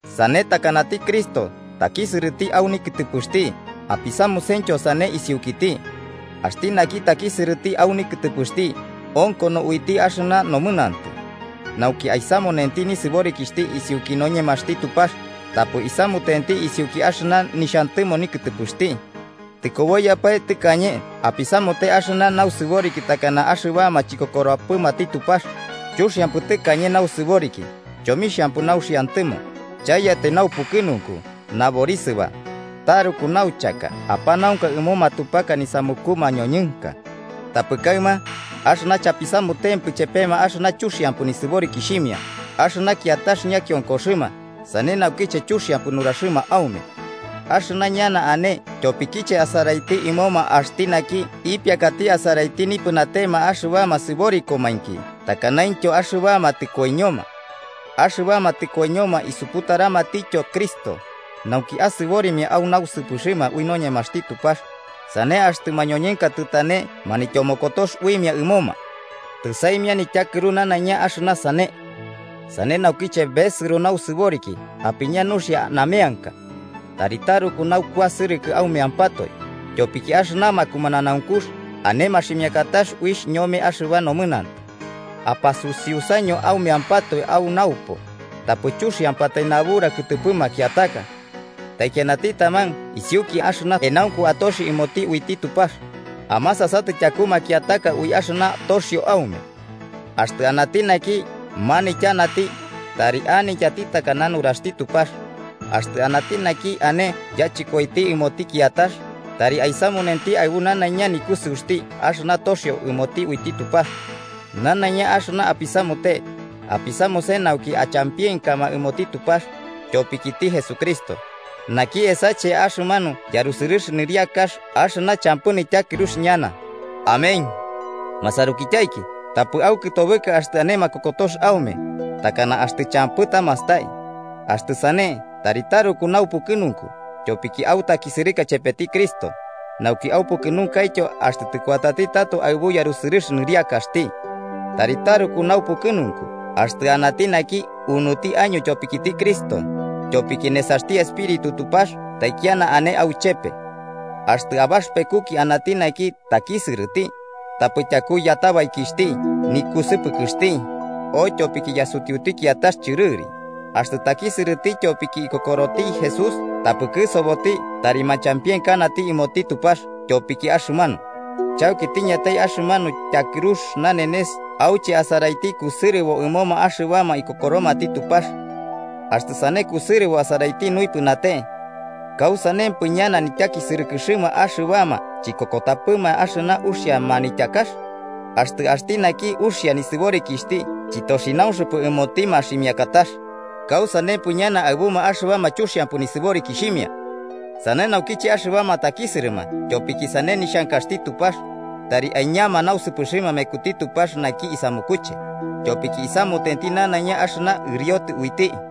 Sane, takanati Cristo takisɨrɨti au nikɨtɨpɨxti, apisamusentyo sane isiukiti. Axti naki takisɨrɨti au nikɨtɨpɨxti onkono uiti axɨna nomɨnantɨ, nauki aisamunenti nisɨborikixhti isiuki noñemaxti Tupax tapɨ isamutenti isiuki axɨna nixhantɨmo nikɨtɨpɨxti. Tɨkoboiyapae tɨkañe apisamute axɨna nausɨboriki takana axɨbama chikokoropɨmati Tupax, chuxiampɨ tɨkañe nausɨboriki, chomixhampɨ nauxiantɨmo, chaiyatai naupukɨnunku naborisɨba, taruku nauchaka apanaunka ɨmo matupaka nisamuku mañoñɨnka. Tapɨ kaɨma, axɨna chapisamutenkipɨ chepema axɨna chuxiampɨ nisɨborikixhimia, axɨma kiatax ñakionkoxɨma sane naukiche chuxiampɨ nuraxɨma aume. Axɨma ñana ane tyopikiche asaraiti ɨmoma axti naki ipiakati asaraiti nipɨnatema axɨbama sɨborikomainki takanaintyo axɨbama tɨkoiñoma. Axɨbama tɨkoiñoma isuputaramatityo Cristo, nauki asɨborimia au nausɨpɨxɨma ui noñemaxti Tupax, sane axtɨ mañoñɨnka tɨtane manityomokotox uimia ɨmoma. Tɨsaimia nityakɨrux nanaiña axɨna sane. Sane naukiche besɨro nausɨboriki apiña nuxia nameanka. Tari taruku naukuasɨrɨkɨ aumeampatoe, tyopiki axɨna makumananaunkux ane maximiakatax uixh ñome axɨba nomɨnantɨ. Apasusiusaño aumeampatoe au naupo, tapɨ chuxiampatai nabura kɨtɨpɨ makiataka. Taikianati taman isiuki axɨna enaunku atoxi ɨmoti uiti Tupax, amasasatɨ tyaku makiataka ui axɨna toxio aume. Axtɨ anati naki manityanati, tari anityati takana nuraxti Tupax. Axtɨ anati naki ane yachɨkoiti ɨmoti kiatax, tari aisamunenti aɨbu nanaiña nikusɨuxti axɨna toxio ɨmoti uiti Tupax. Nanaiña axɨna apisamute, apisamuse nauki achampienkama ɨmoti Tupax tyopikiti Jesucristo, naki esache axɨmanu yarusɨrɨx nɨriakax axɨna champɨ nityakɨrux ñana. Amén. Masarukityaiki, tapɨ aukɨtobɨka axtɨ ane makokotox aume, takana axtɨ champɨ tamastai. Axtɨ sane, tari taruku naupukɨnunku, tyopiki autakisɨrɨka chepeti Cristo, nauki aupukɨnunkaityo axtɨ tɨkuatati tato aɨbu yarusɨrɨx nɨriakaxti. Tari taruku naupukɨnunku, axtɨ anati naki unuti año tyopikiti Cristo, tyopiki nesaxti Espíritu Tupax taikiana ane auchepe. Axtɨ abaxɨpekuki anati naki takisɨrɨti, tapɨ tyaku yatabaikixhti, nikusɨpɨkɨxti, o tyopiki yasutiuti kiatax chɨrɨri. Axtɨ takisɨrɨti tyopiki ikokoroti Jesús, tapɨ kɨsoboti tari ñachampienkanati ɨmoti Tupax tyopiki axɨmanu. Chauki tiñatai axɨmanu tyakɨrux nanenes auche asaraiti kusɨrɨbo ɨmoma axɨbama ikokoromati Tupax. Axtɨ sane kusɨrɨbo asaraiti nuipɨnate, ¿kausanempɨ ñana nityakisɨrɨkɨxɨma axɨbama chikokotapɨma axɨna uxia manityakax? Axtɨ axti naki uxia nisɨborikixhti chɨtoxinaumpɨ ɨmoti maximiakatax, ¿kausanempɨ ñana aɨbuma axɨbama chuxiampɨ nisɨborikixhimia? Sane naukiche axɨbama takisɨrɨma tyopiki sane nixhankaxti Tupax, tari aiñama nausɨpɨxɨma mekuti Tupax naki isamukuche, tyopiki isamutenti nanaiña axɨna ɨriotɨ uiti.